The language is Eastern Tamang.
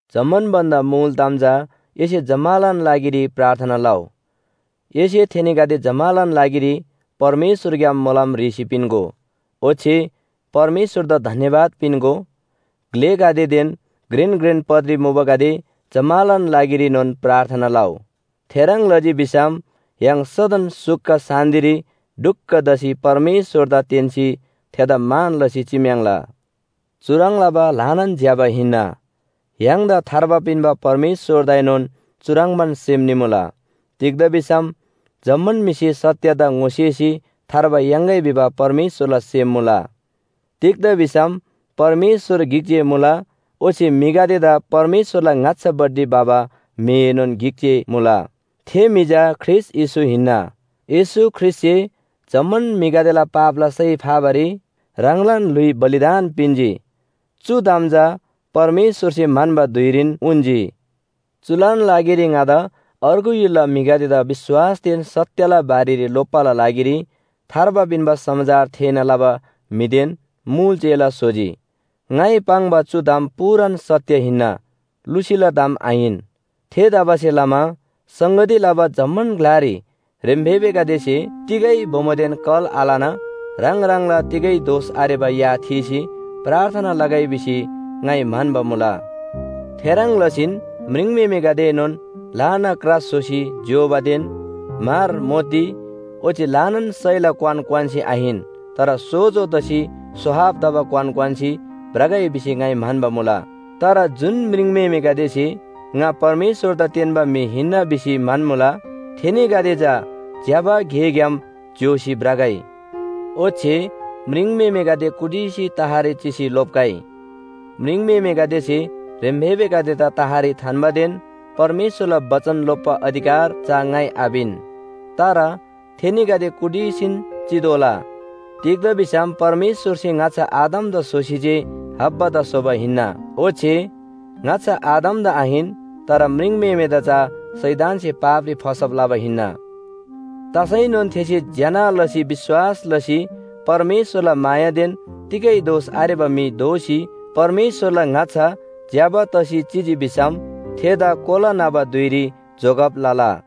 जम्‍मान भन्‍दा मुल ताम चा एसे जम्‍मालान लागिरी प्रार्थना लउ, एसे थेनीगदे जम्‍मालान लागिरी परमेश्‍वरग्‍याम मोलम ह्रीसी पिन्‍गो, ओच्‍छे परमेश्‍वरदा धन्‍यवाद पिन्‍गो। ग्‍लेगदेदेन घ्रेन घ्रेन पदरी मुबागदे जम्‍मालान लागिरीनोन प्रार्थना लउ। थेह्रङ् लजी भिसम य्‍हाङ सदन सुख शान्‍तिरी ढुक्‍क तसी परमेश्‍वरदा तेन्‍सी थेदा मान लसी चिम्‍याङ्ला। चुह्रङ् लबा ल्‍हानान ज्‍यबा हिन्‍ना, य्‍हाङदा थार्बा पिन्‍बा परमेश्‍वरदाएनोन चुह्रङ्बान सेम निमुला। तिग्‍दा भिसम जम्‍मान म्‍हिसे सत्‍यदा ङोसेसी थार्बा याङ्‌गै भिबा परमेश्‍वरला सेम मुला। तिग्‍दा भिसम परमेश्‍वर गिक जे मुला ओच्‍छे म्‍हिगदेदा परमेश्‍वरला ङाच्‍छापट्टि भबा म्‍हिएनोन गिक जे मुला। थे म्‍हि चा ख्रीष्‍ट येशू हिन्‍ना। येशू ख्रीष्‍टसे जम्‍मान म्‍हिगदेला पापला सय फाबारी ह्राङलान ल्‍हुइ बलिदान पिन्‍जी, चु ताम चा परमेश्‍वरसे म्‍हन्‍बा धुइरीन उन्‍जी। चुलान लागिरी ङादा अर्गु य्‍हुलला म्‍हिगदेदा विश्‍वासदेन सत्‍यला बारेरी लोप्‍बाला लागिरी थार्बा पिन्‍बा समाचार थेःना लबा म्‍हिदेन मुल चेला स्‍होजी। ङाइ पाङ्बा चु ताम पूरान सत्‍य हिन्‍ना, लुसीला ताम आहिन। थेतबासेलमा संगती लबा जम्‍मान ग्‍लारी ह्रेम्‍फेबेगदेसे तिगै बोमोदेन कल आलना ह्राङ ह्राङला तिगै दोष आरेबा या थीसी प्रार्थना लगै भिसी ङाइ म्‍हन्‍बा मुला। थेह्रङ् लसीन म्‍ह्रिङम्‍हेमेगदेएनोन ल्‍हाना क्रा स्‍होसी ज्‍योबादेन म्‍हर, मोती ओच्‍छे ल्‍हानान सयला क्‍वान क्‍वान्‍सी आहिन, तर सोजो तसी स्‍वाहब तबा क्‍वान क्‍वान्‍सी भ्रगै भिसी ङाइ म्‍हन्‍बा मुला। तर जुन म्रिङम्‍हेमेगदेसे ङा परमेश्‍वरदा तेन्‍बा म्‍हि हिन्‍ना भिसी म्‍हन्‍मुला थेनीगदे चा ज्‍यबा गेग्‍याम ज्‍योसी भ्रगै। ओच्‍छे म्रिङम्‍हेमेगदे कुटिसी तहरी चिसी लोप्‍गै। म्रिङम्‍हेमेगदेसे ह्रेम्‍फेबेगदेदा तहरी थान्‍बादेन परमेश्‍वरला बचन लोप्‍बा अधिकार चा ङाइ आपिन, तर थेनीगदे कुटीसीन चितोःला। तिग्‍दा भिसम परमेश्‍वरसे ङाच्‍छा आदमदा स्‍होसी जे हव्वादा स्‍होबा हिन्‍ना। ओच्‍छे ङाच्‍छा आदमदा आहिन, तर म्रिङम्‍हेमेदा चा शैतानसे पापरी फसब लबा हिन्‍ना। तसैनोन थेसे ज्‍यना लसी विश्‍वास लसी परमेश्‍वरला मायादेन तिगै दोष आरेबा म्‍हि दोसी परमेश्‍वरला ङाच्‍छा ज्‍यबा तसी चिजी भिसम थेदा कोला न्‍हबा धुइरी जोगब लला।